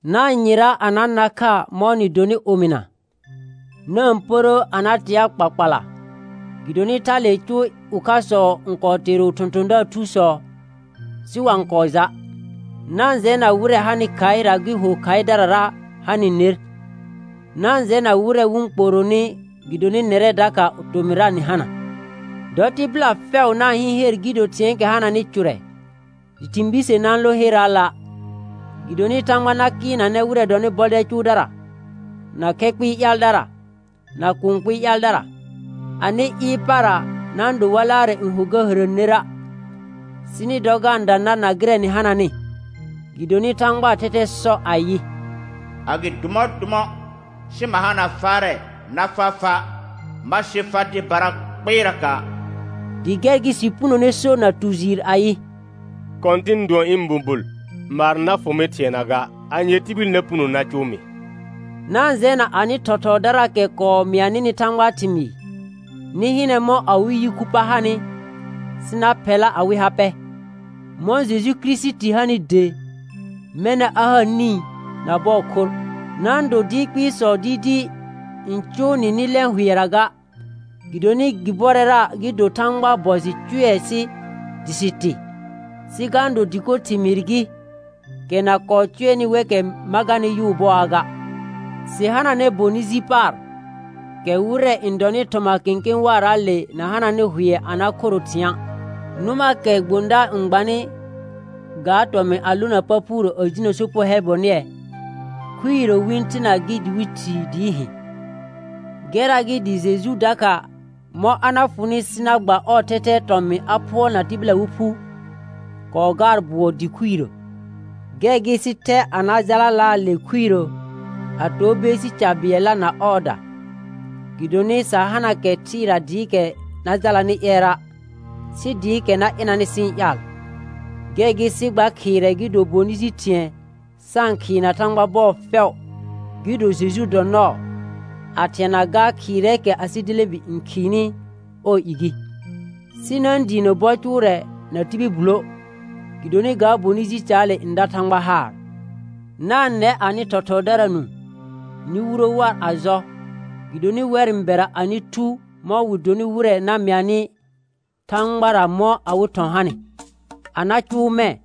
Na-n yɩra a na na kha mɔ̃ nɩ donɩ omɩna. Na-n pərə a na tea kpakpala, gɩdonɩ thalee cʋʋ ʋkhasɔ n kɔɔ teero thɔ̃thɔ̃daar thusɔ sɩ wa-n kɔɔ ja'. Na-n jɛna wɩrɛ hanɩ khaɩra gɩ ho khaɩdarara ha nɩ ner; na-n jɛna wɩrɛ wɩ-n kpooronɩ gɩdonɩ nɛrɛ dakha tomɩrra nɩ hana. Dɔ tɩbɩla fɛʋ na-n hɩɩn her gɩ do thɩ̃ɛɛkɛ hananɩ cʋrɛ, dɩ thɩ̃ bise na-n lõ herraala'. Gɩdonɩ Thãgba na kɩɩlnanɛ wɩrɛ dɔnɩ bɔdɛl cʋʋdara, na khɛ kpɩɩ ƴaaldara, na kũu kpɩɩ ƴaaldara. Anɩ ɩɩr para na-n do war laarɛ n ho ga hərə nera', sɩ nɩ dɔ ga-n da nar na gɩrɛ nɩ hananɩ, gɩdonɩ Thãgbaa thɛthɛ sɔ ayɩ: «A gɩ dʋ mɔ̃ dʋ mɔ̃, sɩ ma hana faarɛ na faa fa'; ma sɩ far dɩbara kpɩɩraka'.» Dɩ gɛr gɩ sɩ punone so na tu jɩɩr ayɩ: «Kɔ̃tɩn dʋɔn ɩ̃ bubul, maar na fʋ mɩ thɩɛna ga; anye tibil na puno na cʋʋ mɩ?» Na-n jɛna anɩ thɔthɔɔdaraakɛ kɔɔ mɩa nɩnɩ Thãgbaa thɩmɩɩ. Nɩ hɩnɛ mɔ̃ awɩ yi khu pa hanɩ, sɩ na phɛla awɩ ha pɛ. Mɔ̃ Jeju Kirisiti hanɩ de, mɛna a ha nĩ na bɔɔ khorr. Na-n do dɩɩr kpɩɩsɔ dɩɩdɩɩ n cʋʋ nɩ nɩ lɛ̃ hʋɛra ga, gɩdonɩ gɩ bɔrɛra gɩ do Thãgbaa bɔ jɩ cʋɛ sɩ dɩ sɩ tɩ, sɩ ga-n do dɩko thɩmɩɩr gɩ, kɛ na kɔɔ cʋɛnɩ wɛkɛ ma garnɩ yʋʋ bɔaa ga. Sɩ hananɛ bonɩ ji paar, kɛ wɩrɛ n dɔnɩ thɔma kẽkẽ waaraale na hananɩ hʋɛ a na khoro thɩ̃a'. Nʋmaakɛ gbõdaar n gbanɩ, ga tɔmɩ̃ a lona pa phuurə a jinə sopugo hɛl bonɩɛ, khuirə wɩ-n thena gɩ dɩ wɩ thii dɩɩ hɩ̃. Gɛrra gɩ dɩ Jeju dakha, mɔ̃ a na fʋnɩ sɩ na gba ɔɔ thɛthɛɛ tɔmɩ̃ a phʋɔlna tɩbɩla wɩ phu, kɔɔ gaar bʋɔ dɩ khuirə. Gɛr gɩ sɩ thɛ a na jalalaa le khuirə a to beesi ca bɩɛlla na ɔɔda. Gɩdonɩ sa hana kɛ thɩɩra dɩɩkɛ na jalanɩ ƴɛrra', sɩ dɩɩkɛ na ɩnanɩ sɩ-n ƴaal. Gɛr gɩ sɩ gba khɩɩrɛ gɩ do bonɩ ji thɩ̃ɛ sa-n khɩɩna Thãgba bɔɔ fɛʋ, gɩ do Jeju dɔ nɔɔ, a thɩɛna gaa khɩɩrɛɛkɛ asɩ delẽbi n khɩɩnɩ ɔɔ i gɩ. Sɩ na-n diinə bɔ cʋʋrɛ na tibil bullə', gɩdonɩ ga bonɩ ji caale n da Thãgba haar. Na-n nɛ anɩ thɔthɔɔdara nũu, nɩ wuro war a jɔ, gɩdonɩ wɛr n bɛra anɩ thu mɔ̃ wɩ donɩ wɩrɛ na mɩanɩ Thãgbara mɔ̃ awɩ thɔ̃ hanɩ. A na cʋʋ mɛ̃,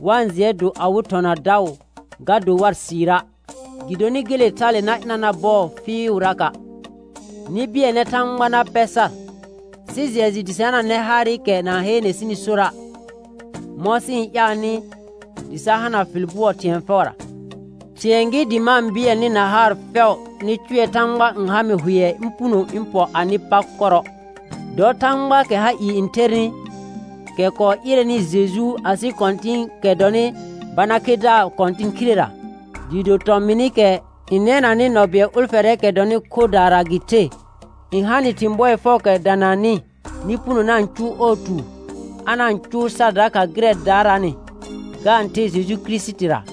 wa-n jɩɛ do awɩ thɔ̃ na daʋ ga do war sɩɩra', gɩdonɩ gele thale na ɩna nar bɔɔ fɩɩʋraka'. Nɩ bɩɛlnɛ Thãgba na pɛ sar. Sɩ jɩɛ jɩ dɩ sɩ hananɛ haarɩkɛ na-n heene sɩnɩ sora', mɔ̃ sɩ-n ƴaalnɩ dɩ sa hana fɩl bʋɔ thɩ̃ɛ fɛʋra. Thɩ̃ɛ gɩ dɩ ma-n bɩɛl nɩ na haar fɛʋ nɩ cʋɛ Thãgba n ha mɩ hʋɛ ɩ̃ puno ɩ̃ pɔ anɩ pa kɔrɔ. Dɔ Thãgbaakɛ ha ɩɩ n thernɩ, kɛ kɔɔ ɩrɛnɩ Jeju asɩ Kɔ̃tɩ̃ɩkɛ dɔnɩ bana khedaar kɔ̃tɩn khirera, dɩɩ do tɔmɩnɩkɛ n nɛnanɩ nɔ bɩɛl ʋlfɛrɛɛkɛ dɔnɩ khorrdaara gɩ the, n ha nɩ thɩ̃ bɔɩ fɛʋʋkɛ dananɩ nɩ puno na-n cʋʋ ɔɔ tuur, a na-n cʋʋ sar dakha gɩrɛ daaraanɩ, ga-n the Jeju Kirisitira;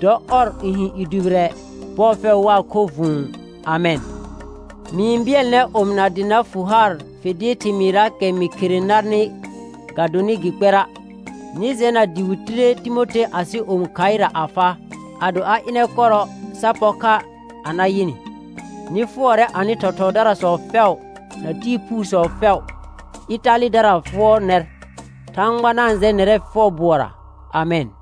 dɔ ɔr n hɩ̃ i dʋbɩrɛ bɔɔ fɛʋ waa khorr vʋ̃ʋ. Amɛn. Mɩ-n bɩɛl nɛr omɩna dɩ na fʋ haar fɩl dɩɩr thɩmɩɩrraakɛ mɩ khere narnɩ ga donɩ gɩ kpɛra'. Nɩ jɛna dɩ wɩ tire Timothe asɩ omi khaɩra a faa. Ado a ɩnɛ kɔrɔ sa pɔr kha a na yɩ nɩ. Nɩ fʋɔrɛ anɩ thɔthɔɔdarasɔ fɛʋ na tɩɩ phuusɔ fɛʋ. Ɩtalɩdara fʋɔr nɛr. Thãgba na-n jɛ nɛrɛ fɛʋ bʋɔra. Amɛn.